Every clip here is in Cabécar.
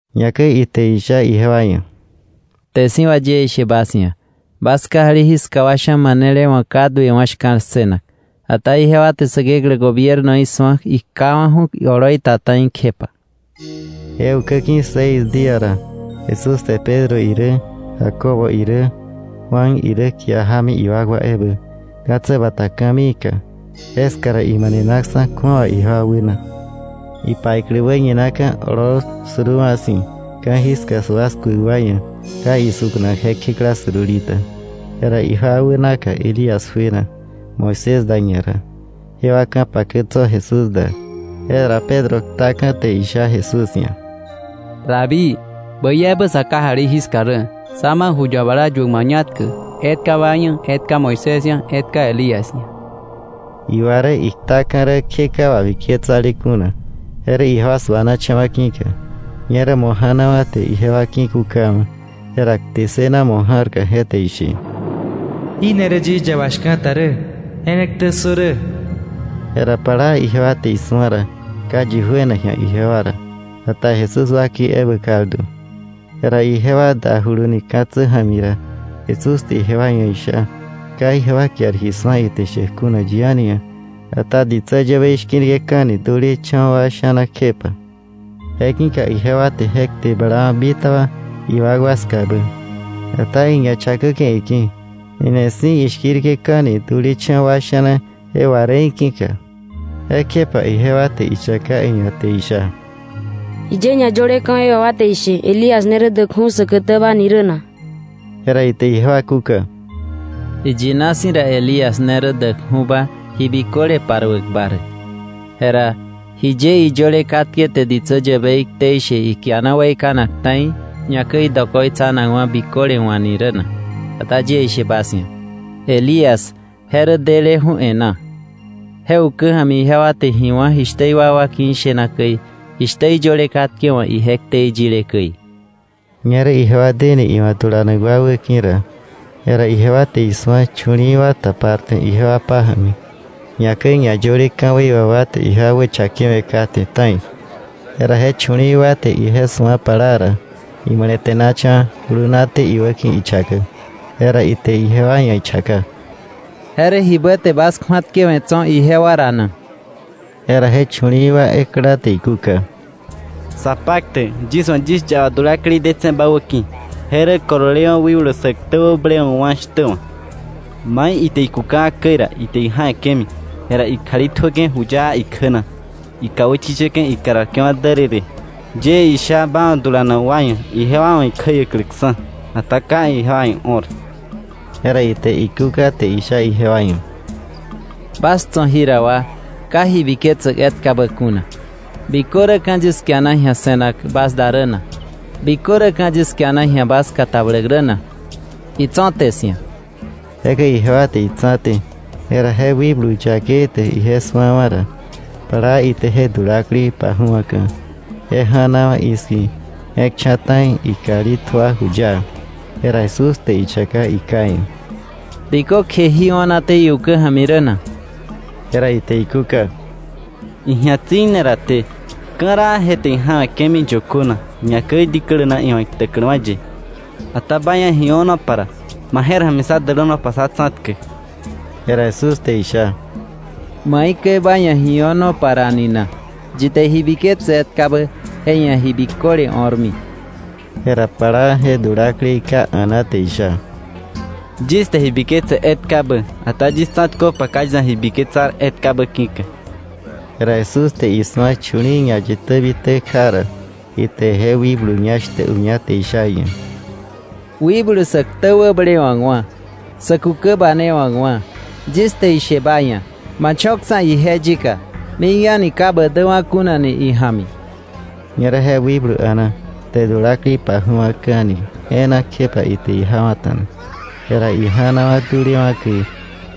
Ñakäi ite isha ijewa ia̱: —Kte si̱ wà yie ishe bas ia̱, bas kajali jiska wa sha̱ manele wa̱ ka duewa̱ shka̱l ssënak, ata ijewa te Säkeklä gobiernoí su̱a ikjawa̱ju̱ oloi ta ta̱i kjepa. Je ukä ki̱ seis día ra, Jesús te Pedro irä Jacobo irä Juan irä kia jámi iwakwa ebä, ka̱tsä bata ka̱miika. Jeska ra imanenaksa̱ kju̱awa ijewa wäna. Ipaiklä wäñinaka̱ oloo suruuwa̱ si̱, ka̱jiska sua skuäk wa ia̱ ka isuka̱nak je kjekla surulita. Jera ijewa wänaka Elías juena Moisés da ñara, jewa ka̱pakä tso̱ Jesús da. Jera Pedro ktaka̱ te isha Jesús ia̱; —Rabí, ¡bäi ebä sa kajali jiska rä! Sá ma ju yabala yuäk mañatkä: etka ba ia̱, etka Moisés ia̱, etka Elías ia̱. Iwa rä iktaka̱ rä kje ka wabiketsale kuna, je rä ijewa suanacha̱wa̱ ki̱ka. Ñerä mo̱ ja̱nawa̱ te ijewa ki̱kukawa̱. Jera kte ssëna mo̱ ja̱rka je te ishe: “Jí ne rä yis yaba shka̱ta rä. Je ne ktä ssö rä.” Jera plaa ijewa te isu̱a ra, ka yi juena ji̱a ijewa ra, ata Jesús wakei ebä kaldu. Jera ijewa dajuluni ka̱tsä ja̱mi ra, Jesús te ijewa ia̱ isha ka ijewa kiar ji su̱a ite shäk kuna yi a̱ni ia̱, ata ditsä yäbei shki̱rke̱ka̱ni dulecha̱wa̱ wa sha̱na kjepa. Je ki̱ka ijewa te je kte blawa̱ bitaba iwakwa skabä. Ata iña chakäke̱ iki̱, jini si̱ ishki̱rke̱ka̱ni dulecha̱wa̱ wa sha̱na je wà räí̱ ki̱ka. Jekjepa ijewa te ichaka iia̱ te isha: —¿Jiye ñayöle ka̱wei wà wa te ishe Elías ne rä däkju̱ säkätäba ni rä na? Jera ite ijewa kúka: —Iyina si̱ ra, Elías ne rä däkju̱ba ji biköle paruäkba rä. Jera ¿jiye iyöle katke te ditsä yäbei ktei she ikiana weikanak ta̱i, ñakäi dokoitsanakwa̱ biköle wa̱ ni rä na? Ata yie ishe bas ia̱, Elías je rä deleju̱ e̱ná; je ukä ja̱mi ijewa te ji wá̱ jishtä iwakwa ki̱ ishena käi, jishtä iyöle katke wa̱ ije ktei yile käi. Ñerä ijewa deni iwa̱ dulanak wa wäki̱ ra, jera ijewa te isu̱a chu̱li̱i̱wa̱ taparte ijewa pája̱mi, ñakäi ñayöle ka̱wei wà wa te ijewa wächakewe̱ kate ta̱i. Jera je chu̱li̱i̱ wa te ije su̱a plaa ra, imale̱te̱nacha̱wa̱ julunaté iwäki̱ ichakäk. Jera ite ijewa ia̱ ichaka: —¿Je rä jibä te bas kju̱atkewe̱ tso̱ ijewa ra na? Jera je chu̱li̱i̱ wa ekla te ikúka: —Sapaktäk, yis wa̱ yis yaba dulaklei detse̱ ba wäki̱. Je rä kololewa̱ wikblu sä ktä wäblewa̱kwa̱ shtä wa̱. Mai ite ikukawa̱ käi ra, ite ija̱we̱ke̱mi. Jera ikjali tjuäke̱ juyaa ikjä na, ikà wächichäke̱, ikararke̱wa̱ därërë. Yie isha ba wa̱ dulanak wa ia̱ ijewa wa̱ ikjäiäkläksa̱, ata ka ijewa ia̱ io̱r. Jera ite ikúka te isha ijewa ia̱: —¡Bas tso̱ jira wa ka ji biketsäk etkabä kuna! ¿Bikö räka̱ yis kiana ji̱a se̱nak bas da rä na? ¿Bikö räka̱ yis kiana ji̱a bas katabläk rä na? Itso̱té 'sia̱. Jekäi ijewa te itsa̱té. Jera je wikblu yakei te ije su̱awa̱ ra, plaa ite je dulaklei paju̱aka̱, je ja̱nawa̱ i̱ski̱, je̱k cha̱ ta̱i, ikjali tjua juyaa. Jera Jesús te ichaka iká ia̱: —¿Bikökje jí o̱naté iukä ja̱mi rä na? Jera ite ikúka: —Iji̱a tsi̱ne raté. Ka̱raa je te ija̱we̱ke̱mi yökö na, ñakäi diklä naka, iwa̱ iktäkläwa̱ ye. Ata ba ia̱ ji o̱nopa ra, ¡ma je̱r ja̱mi sá dälänopa, sá tsa̱tkäk! Jera Jesús te isha: —¿Maikäi ba ia̱ ji o̱nopa ra ni na? Yi te ji biketse etkabä, je ia̱ ji biköle o̱rmi. Jera plaa je dulaklei ká a̱na te isha: —Yis te ji biketse etkabä, ata yis tsa̱tköpa ka yis ia̱ ji biketsar etkabä ki̱ka. Jera Jesús te isu̱a chu̱li̱i̱ ñayitä bitä kja ra, ite je wikblu ñá shtä uña te isha iia̱: —Wikblu sä ktä wäblewa̱kwa̱, sä kukä banewa̱kwa̱, yis te ba ia̱ ishe, ma cho̱ksa̱ ije yika, mik a̱ni ka ba däwa̱ kunani ija̱mi. Ñerä je wikblu a̱na, te dulaklei paju̱wa̱ka̱ni e̱e̱na, kjepa ite ijawa̱ta̱na. Jera ija̱nawa̱ dulewa̱ käi,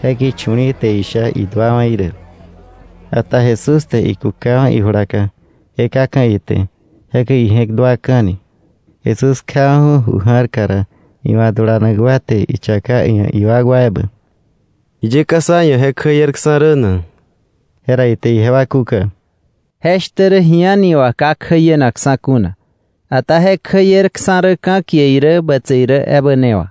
je ki̱ chu̱li̱i̱ te isha iduawa̱ irä. Ata Jesús te ikukawa̱ ijulaka, je kaka̱ ite. Jekäi ije̱k duaka̱ni. Jesús kjawa̱ju̱ ju ja̱rka ra, iwa̱ dulanak wa te ichaka iia̱ iwakwa ebä: —¿Jiye ka sá ia̱ je kjäierksa̱ rä na? Jera ite ijewa kúka: —Je shtä rä ji a̱ni wà ka kjäienaksa̱ kuna, ata je kjäierksa̱ rä ka̱kie irä bätse irä ebä ne wà.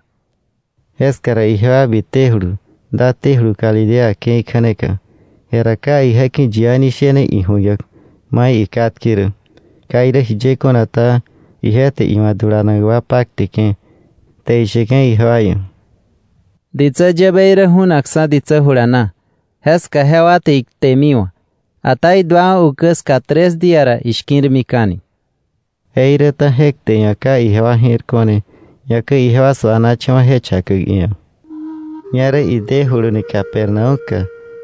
Jeska ra ijewa bitejulu, datéjulu Galilea ke̱i kja̱neka, jera ka ije ki̱ yi a̱ni shene iju̱ñak mai ikatke rä. Ka irä jiye kuna ta, ije te iwa̱ dulanak wa pakteke̱, te isheke̱ ijewa ia̱: —Ditsä yäbei rä ju̱nakksa̱ ditsä jula na, jeska jewa te iktemiwa̱, ata iduawa̱ ukä ska tres día ra ishki̱rmika̱ni. Jeiräta je kte ia̱ ka ijewa je̱r ko̱ne, ñakäi ijewa suanacha̱wa̱ je chakäk iia̱. Ñerä idejuluni Capernaúm ska.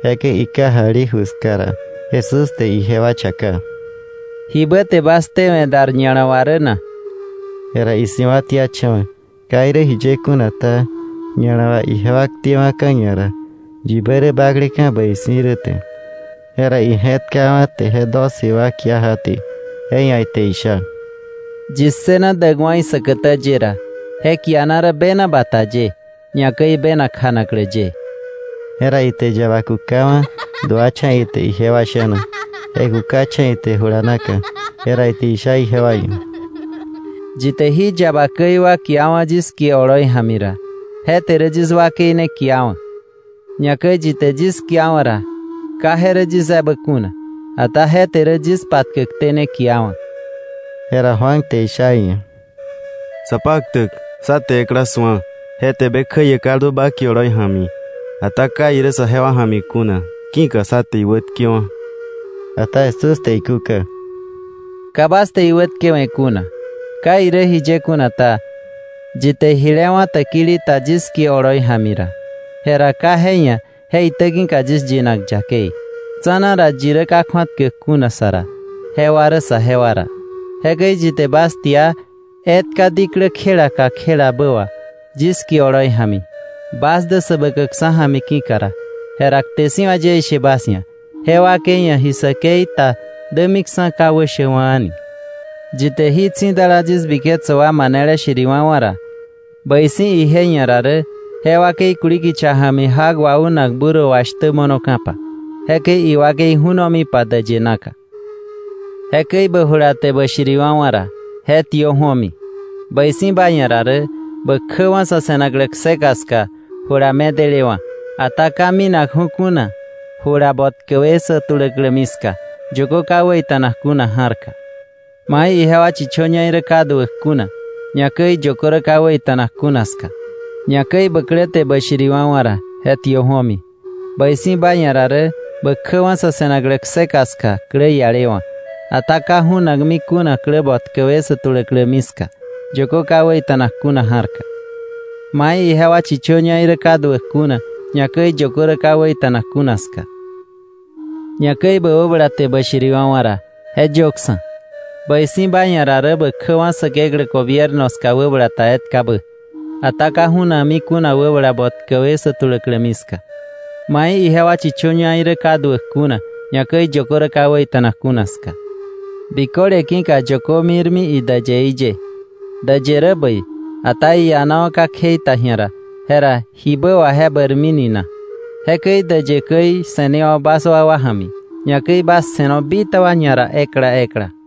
Jekäi ikajali ju ska ra, Jesús te ijewa chaka: —¿Jibä te bas ktewe̱ dar ña̱la wà rä na? Jera isi̱wa̱tiacha̱wa̱. Ka irä jiye kuna ta, ña̱la wà ijewa ktewa̱ka̱ ñara yibä rä bakleka̱ bäi si̱ rä te. Jera ije̱tkawa̱, te je doce wa kia jaté, je ia̱ ite isha: —Yi ssëna däkwa̱ isäkätä ye ra, je kiana rä bena bata ye, ñakäi bena kjanaklä ye. Jera ite yaba kukawa̱, duacha̱ ite ijewa sha̱na, je kukacha̱ ite jula naka, jera ite isha ijewa ia̱: —Yi te jí yaba käi wa kiawa̱ yis kie oloi ja̱mi ra, je te rä yis wakei ne kiawa̱. Ñakäi yi te yis kiawa̱ ra, ka je rä yis ebä kuna, ata je te rä yis patkäkté ne kiawa̱. Jera Juan te isha iia̱: —Sapaktäk, sá te ekla su̱a, je te be kjäie kaldu ba kie oloi ja̱mi. Ata ka irä sajewa ja̱mi kuna, ki̱ka sá te iwätkewa̱. Ata Jesús te ikúka: —Ka bas te iwätkewe̱ kuna. Ka irä jiye kuna ta, yi te jile wá̱ täkili ta yis kie oloi ja̱mi ra, jera ka je ia̱ je itä ki̱ka yis yinak yakei. Tsa̱na ra, yi rä ka kju̱atkäk kuna sa ra, jewa rä saje wa ra. Jekäi yi te bas tia etka diklä kjela kakjelabä wà yis kie oloi ja̱mi, bas dä Säbäkäkksa̱ ja̱mi ki̱ka ra, jera kte si̱ wà yie ishe bas ia̱, je wakei ia̱ ji säkei ta dämiksa̱ ka wäshäkwa̱ a̱ni. “Yi te jí tsi̱dala yis biketsäk wa manele shiriwa̱wa̱ ra, bäi si̱ ije ia̱ ra rä je wakei kuli kicha ja̱mi jak waunak burro wà shtä mo̱noka̱pa, jekäi iwakei ju̱nomipa däyë naka. Jekäi bä jula te bä shiriwa̱wa̱ ra, je tiö ju̱omi. Bäi si̱ ba ia̱ ra rä bä kjäwa̱ sa̱ se̱naklä kseka ska jula medelewa̱, ata ka minakju̱ kuna jula botkäwe sä tuläklämi ska, yökö ka wäita̱nak kuna ja̱rka, mai ijewa chichöñaí rä ka duäk kuna, ñakäi yökö rä ka wäita̱nak kuna ska. Ñakäi bä klä te bä shiriwa̱wa̱ ra, je tiö ju̱omi. Bäi si̱ ba ia̱ ra rä bä kjäwa̱ sa̱ se̱naklä kseka ska klä ialewa̱, ata ka ju̱nakmi kuna klä botkäwe sä tuläklämi ska, yökö ka wäita̱nak kuna ja̱rka, mai ijewa chichöñaí̱ rä ka duäk kuna, ñakäi yökö rä ka wäita̱nak kuna ska. Ñakäi bä wäbala te bä shiriwa̱wa̱ ra, je yöksa̱. Bäi si̱ ba ia̱ ra rä bä kjäwa̱ Säkeklä gobierno ska wäbala ta etkabä, ata ka ju̱nakmi kuna wäbala botkäwe sä tuläklämi ska, mai ijewa chichöñaí rä ka duäk kuna, ñakäi yökö rä ka wäita̱nak kuna ska. “Biköle ki̱ka yökö mirmi idäyeí ye. Däyë rä bäi, ata iianawa̱ ka kjei ta ji̱a ra, jera ¿jibä wà je bäirmini na? Jekäi däyë käi se̱newo̱ bas wakwa ja̱mi, ñakäi bas se̱no bitaba ñara ekla ekla.”